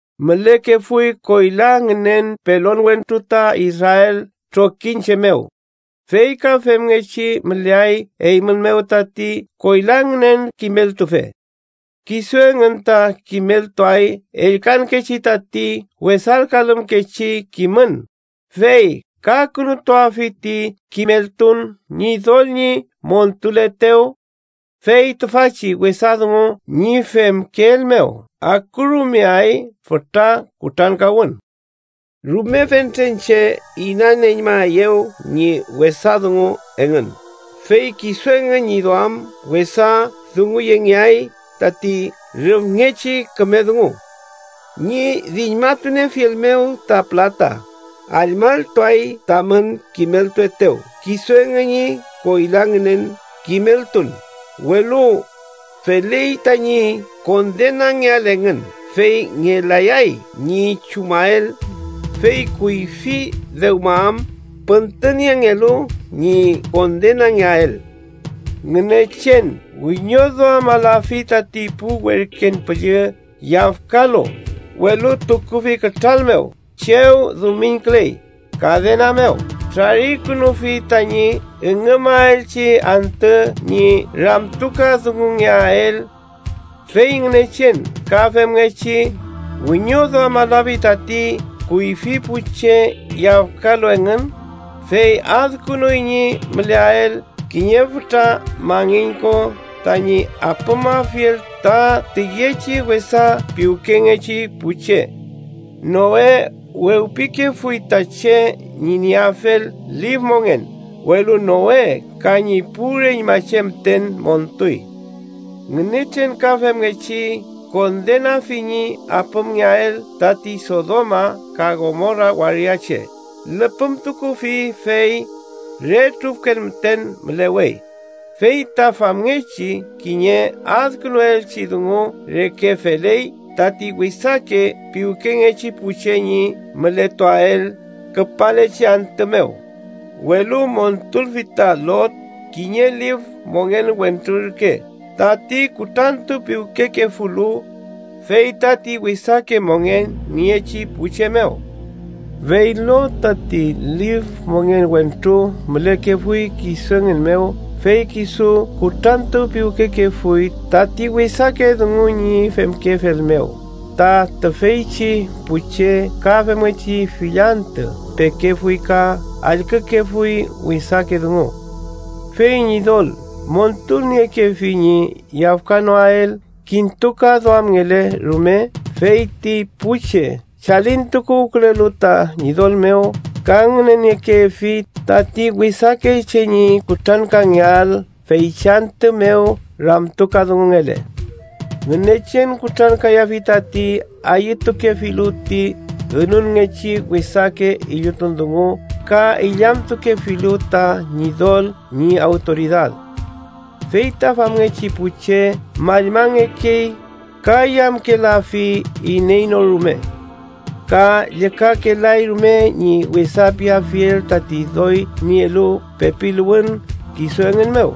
Mülekefuy koyla ngünen pelon wentru ta Israel trokiñche mew. Fey ka femngechi müleay eymün mew tati koyla ngünen kimeltufe. Kisu engün ta kimeltuay ellkankechi tati wesalkalümkechi kimün, fey kakünutuafi ti kimeltun Ñidol ñi montuletew: fey tüfachi wesa dungu ñi femkeel mew akurumeay fütra kutrankawün. Rume fentren che inañmayaeyew ñi wesa dungu engün, fey kisu engün ñi duam wesa dunguyengeay tati rüfngechi küme dungu. Ñi diñmatuniefiel mew ta pülata, allmalltuay tamün kimeltuaetew kisu engün ñi koyla ngünen kimeltun, welu feley tañi kondenangeael engün fey ngelayay ñi chumael, fey kuyfi dewma am püntüniengelu ñi kondenangeael. Ngünechen wiñoduamalafi tati pu werken püllü yafkalu, welu tukufi kütral mew chew dumiñküley, kadena mew trarikünufi tañi üngümaelchi antü ñi ramtukadungungeael. Fey Ngünechen ka femngechi wiñoduamalafi tati kuyfi pu che yafkalu engün, fey adkünuy ñi müleael kiñe fütra mangin ko tañi apümafiel ta tüyechi wesa piwkengechi pu che. Noe wewpikefuy ta che ñi nieafel lif mongen, welu Noe ka ñi pu reñmache müten montuy. Ngünechen ka femngechi kondenafi ñi apümngeael tati Sodoma ka Gomora waria che, lüpümtukufi fey re trufken müten mülewey, fey ta famngechi kiñe adkünuelchi dungu reke feley tati wesake piwkengechi pu che ñi mületuael küpalechi antü mew. Welu montulfi ta Lot, kiñe lif mongen wentru ürke tati kutrantupiwkekefulu, fey tati wesake mongen niechi pu che mew. Fey Lot tati lif mongen wentru mülekefuy kisu engün mew fey kisu kutrantupiwkekefuy tati wesake dungu ñi femkefel mew ta tüfeychi pu che ka femngechi fill antü pekefuy ka allkükefuy wesake dungu. Fey Ñidol montulniekefi ñi yafkanoael kintukaduamngele rume fey ti pu che chalintukuwkülelu ta Ñidol mew ka ngüneniekefi tati wesake che ñi kutrankangeael feychi antü mew ramtukadungungele. Ngünechen kutrankayafi tati ayütukefilu ti ünunngechi wesake illutun dungu ka illamtukefilu ta Ñidol ñi awtoridad. Fey ta famngechi pu che mallmangekey ka yamkelafi iney no rume, ka llükakelay rume ñi wesa piafiel tati doy nielu pepiluwün kisu engün mew.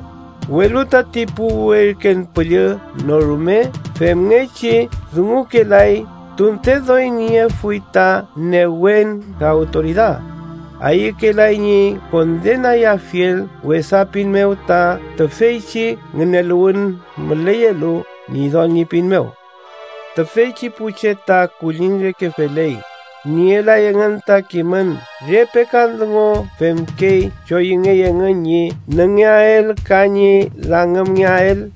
Welu tati pu werken püllü no rume femngechi dungukalay, tunte doy niefuy ta newen ka awtoridad, ayükelay ñi kondenayafiel wesa pin mew ta tüfeychi ngüneluwün müleyelu Ñidol ñi pin mew. Tüfeychi pu che ta kulliñ reke feley: nielay engün ta kimün re pekan dungu femkey choyüngey engün ñi nüngeael ka ñi langümngeael.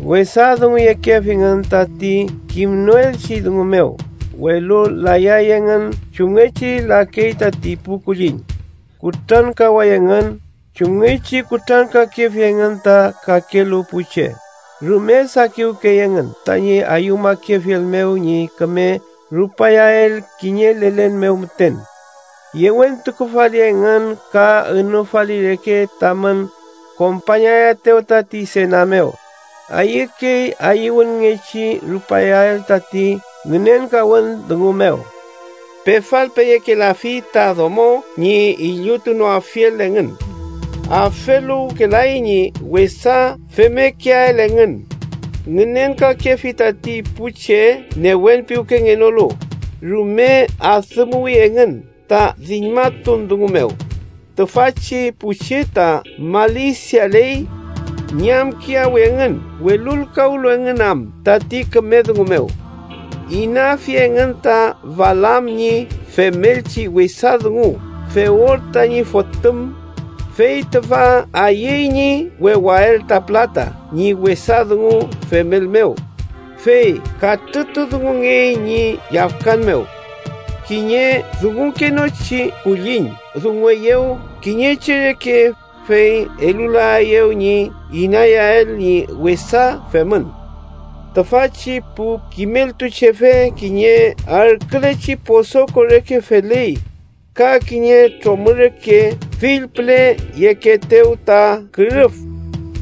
Wesa dunguyekefingün tati kimnoelchi dungu mew, welu layay engün chumngechi lakey tati pu kulliñ. Kutrankaway engün chumngechi kutrankakefi engün ta kakelu pu che. Rume sakiwkey engün tañi ayüwmakefiel mew ñi küme rupayael kiñe lelen mew müten. ¡Yewentukufali engün ka ünufali reke tamün kompañaetew tati sena mew, ayükey ayüwünngechi rupayael tati ngünenkawün dungu mew! Pefalpeyekelafi ta domo ñi illutunoafiel engün. Afeluwkelay ñi wesa femmekeael engün. Ngünenkakefi tati pu che newenpiwkengenolu, rume adümuwi engün ta diñmatun dungu mew, tüfachi pu che ta malisialey. Ñamkiyawi engün welulkawlu engün am tati küme dungu mew. Inafi engün ta Balaam ñi femelchi wesa dungu Beor tañi fotüm, fey tüfa ayüy ñi wewael ta pülata ñi wesa dungu femel mew, fey katrütudungungey ñi yafkan mew. Kiñe dungukenochi kulliñ dungueyew kiñe che reke, fey elulaeyew ñi inayael ñi wesa femün. Tüfachi pu kimeltuchefe kiñe arkülechi posoko reke feley, ka kiñe tromü reke fill püle yekeetew ta kürüf,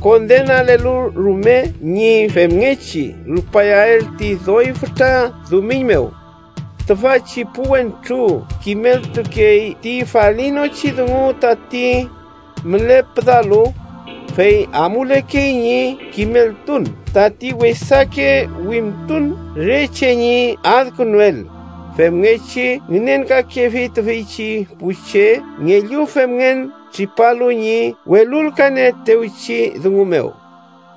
kondenalelu rumel ñi femngechi rupayael ti doy fütra dumiñ mew. Tüfachi pu wentru kimeltukey ti falinochi dungu tati mülepüdalu, fey amulekey ñi kimeltun tati wesake wimtun re che ñi adkünuel femngechi ngünenkakefi tüfeychi pu che ngellu femngen tripalu ñi welulkalnieetewchi dungu mew.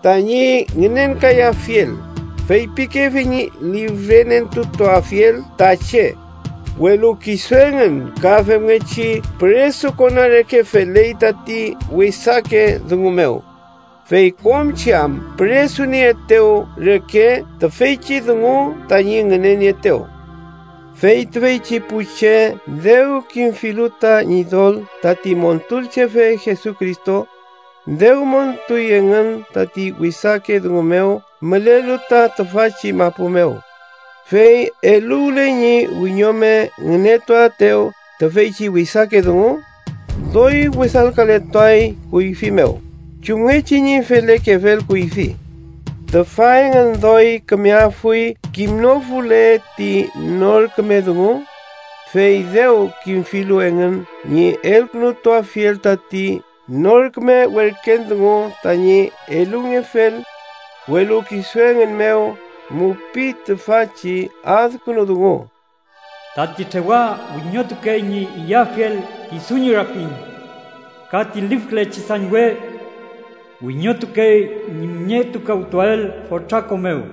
Tañi ngünenkayafiel, feypikefi ñi lifrenentutuafiel ta che, welu kisu engün ka femngechi püresukona reke feley tati wesake dungu mew, fey kom che am püresunieetew reke tüfeychi dungu tañi ngünenieetew. Fey tüfeychi pu che dew kimfilu ta Ñidol tati Montulchefe Jesucristo, dew montuy engün tati wesake dungu mew mülelu ta tüfachi mapu mew. Fey eluwle ñi wiñome ngünetuaetew tüfeychi wesake dungu, doy wesalkaletuay kuyfi mew, chumngechi ñi felekefel kuyfi. Tüfa engün doy kümeafuy kimnofule ti nor küme dungu, fey dew kimfilu engün ñi elkünutuafiel tati nor küme werken dungu tañi elungefel. Welu kisu engün mew mupiy tüfachi adkünu dungu: “Tati trewa wiñotukey ñi iyafiel kisu ñi rapin” ka “ti lifkülechi sañwe wiñotukey ñi müñetukawtuael fotra ko mew.”